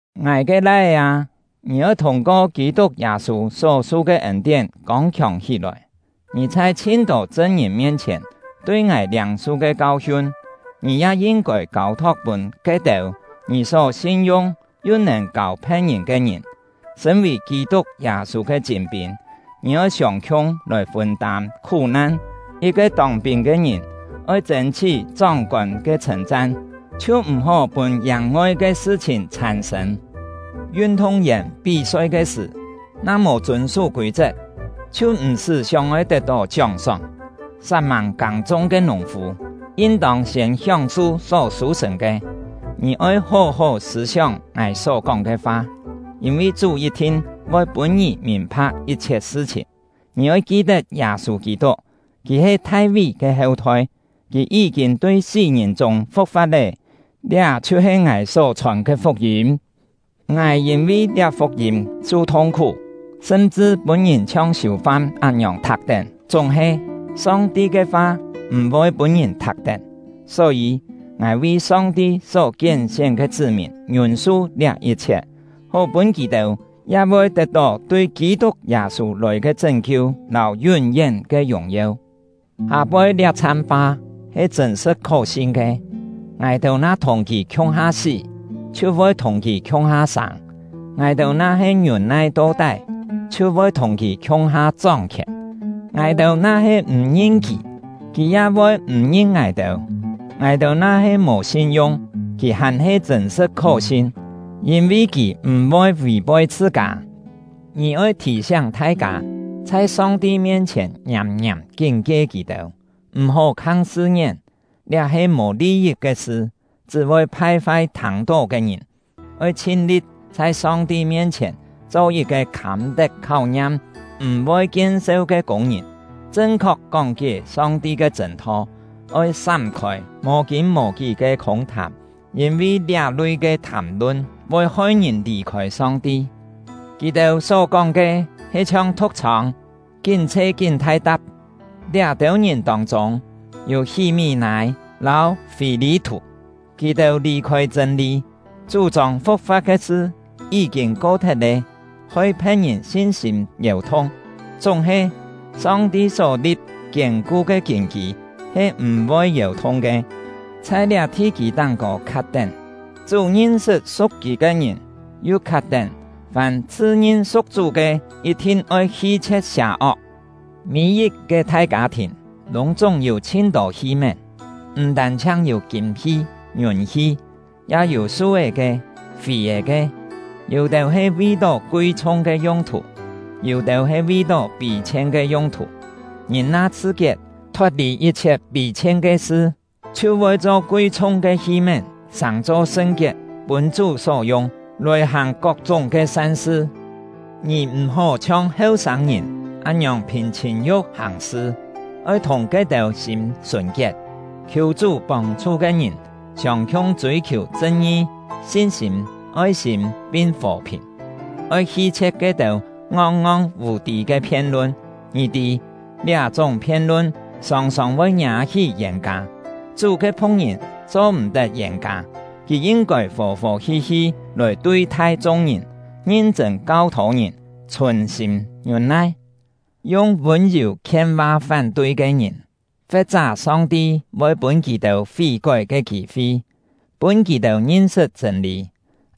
Ngài ke lai-é â, ngì oi thûng-ko Kî-tuk Yâ-sû só-su ke ên-tién kông-khiòng hí-lòi. Ngì chhai chhin-tô chṳn-ngìn mien-chhièn tui ngài liâng-su ke kau-hiun, ngì ya yin-kôi kâu-thok pûn ke-têu ngì só sin-yung yu nèn kâu phe̍t-ngìn ke ngìn. Sṳ̂n-vì Kî-tuk Yâ-sû ke chîn-pîn, ngì oi siông-khiung lòi fûn-tâm khú-nan. Yit-ke tông-pîn ke ngìn oi chên-chhí chóng-kôn ke chhṳ̂n-chan, chhiu m̀-hó pûn yàng-ngoi ke sṳ-chhìn chhàn-sṳ̂n. Yun-thung-yèn pí-soi ke sṳ̀ na mò chûn-sú kûi-chet, chhiu m̀-sṳ́ sióng-oi tet-tó chióng-sóng. Sat-mâng kâng-chung ke nùng-fû yin-tông siên hióng-su só sû-sṳ̀n ke. Ngì oi hó-hó sṳ̂-sióng ngài só-kóng ke fa, yîn-vi Chú yit-thin voi pûn ngì mìn-pha̍k yit-chhiet sṳ-chhìn. Ngì oi ki-tet Yâ-sû Kî-tuk; kì he Thai-ví ke heu-thoi, kì yí-kîn tui sí-ngìn chûng fu̍k-fa̍t lé; liá chhiu-he ngài só-chhòn ke fuk-yîm. Ngài yîn-vi liá fuk-yîm su thung-khú, sṳm-chṳ pûn-ngìn chhiong siù-fam án-ngiòng thak-tén; chúng-he, Song-ti ke fa m̀-voi pûn-ngìn thak-tén. Só-yî, ngài vi Song-ti só kién-sién ke chṳ́-mìn ngiûn-su liá yit-chhiet, hó pûn kì-têu ya voi tet-tó tui Kî-tuk Yâ-sû lòi ke chṳ́n-kiu lâu yún-yén ke yùng-yeu. Hâ-poi liá-chham fa he chṳ̂n-sṳ̍t khó-sin ke: Ngài-têu na thùng kì khiung-ha sí, chhiu voi thùng kì khiung-ha sâng. Ngài-têu na-he ngiûn-nai to-tái, chhiu voi thùng kì khiung-ha chóng-khièn. Ngài-têu na-he m̀ ngin kì, kì ya voi m̀ ngin ngài-têu. Ngài-têu na-he mò sin-yung, kì hàn-he chṳ̂n-sṳ̍t khó-sin, yîn-vi kì m̀-voi vì-poi chhṳ-kâ. Ngì oi thì-siáng thai-kâ, chhai Song-ti mien-chhièn ngiàm-ngiàm kín-kie kì-têu: M̀-hó khang sṳ-ngién; liá he mò li-yit ke sṳ, chṳ́ voi phai-fai thâng-tó ke ngìn. Oi chhin-li̍t chhai Song-ti mien-chhièn cho yit-ke khâm-tet kháu-ngiam, m̀-voi kien-seu ke kûng-ngìn, chṳn-khok kóng-kié Song-ti ke chṳ̂n-tho. Oi sám-khôi mò-kîn-mò-kí ke khûng-thàm, yîn-vi liá-lui ke thàm-lun voi hoi ngìn lì-khôi Song-ti; kì-têu só-kóng ke he chhiong thu̍k-chhông, kín chhe kín thai-ta̍p. Liá-têu ngìn tông-chûng, yû Hí-mí-nâi lâu Fî-lî-thù; kì-têu lì-khôi chṳ̂n-lî, chú-chông fu̍k-fa̍t ke sṳ yí-kîn ko-thet lé, hoi phe̍t-ngìn sin-sîm yèu-thung. Chúng-he, Song-ti só-li̍p kiên-ku ke kîn-kî he m̀-voi yèu-thung ke; chhai liá thi-kî táng-kô khat-tén: “Chú ngin-sṳt su̍k Kì ke ngìn”, yu khat-tén: “Fàm chhṳ-ngin su̍k Chú ke, yit-thin oi hi-chhie̍t sià-ok.” Mî-yit-ke thai kâ-thìn lûng-chúng yû chhin-tô hi-mén, m̀ tân-chhiang yû kîm-hi ngiùn-hi, ya yû su-é ke, fì-è ke; yû-têu he vi-tó kui-chhung ke yung-thù, yû-têu he vi-tó pî-chhien ke yung-thù. Ngìn na chhṳ-kiet, thot-lì yit-chhiet pî-chhien ke sṳ, chhiu voi cho kui-chhung ke hi-mén, sàng-cho sṳn-kiet, pûn Chú só yung, lòi hàng kok-chúng ke san-sṳ. Ngì m̀-hó chhiong heu-sâng-ngìn án-ngiòng phìn chhìn-yu̍k hàng-sṳ; oi thùng ke-têu sîm sùn-kiet, khiù Chú pông-chhu ke ngìn siông-khiung chûi-khiù chṳn-ngi, sin-sîm, oi-sîm, pin fò-phìn. Oi hi-chhie̍t ke-têu ngong-ngong vù-tî ke phien-lun; ngì tî, liá-chúng phien-lun sòng-sòng voi ngiâ-hí yên-kâ. Chú ke phu̍k-ngìn cho-m̀-tet yên-kâ; kì yin-kôi fò-fò hi-hi lòi tui-thai chung-ngìn, ngin-chṳ̂n kau-thô ngìn, chhùn-sîm ngiûn-nai, yung vûn-yù khien-va fán-tui ke ngìn. Fe̍t-chá Song-ti voi pûn kì-têu fí-kói ke kî-fi, pûn kì-têu ngin-sṳt chṳ̂n-lî.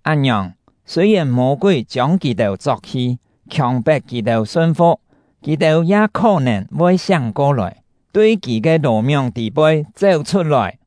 Án-ngiòng, sûi-yèn Mô-kúi chiông kì-têu chok-hi, khiòng-pet kì-têu sun-fu̍k, kì-têu ya khó-nèn voi siáng ko-lòi, tui kì ke lò-mióng tî-poi chéu-chhut-lòi.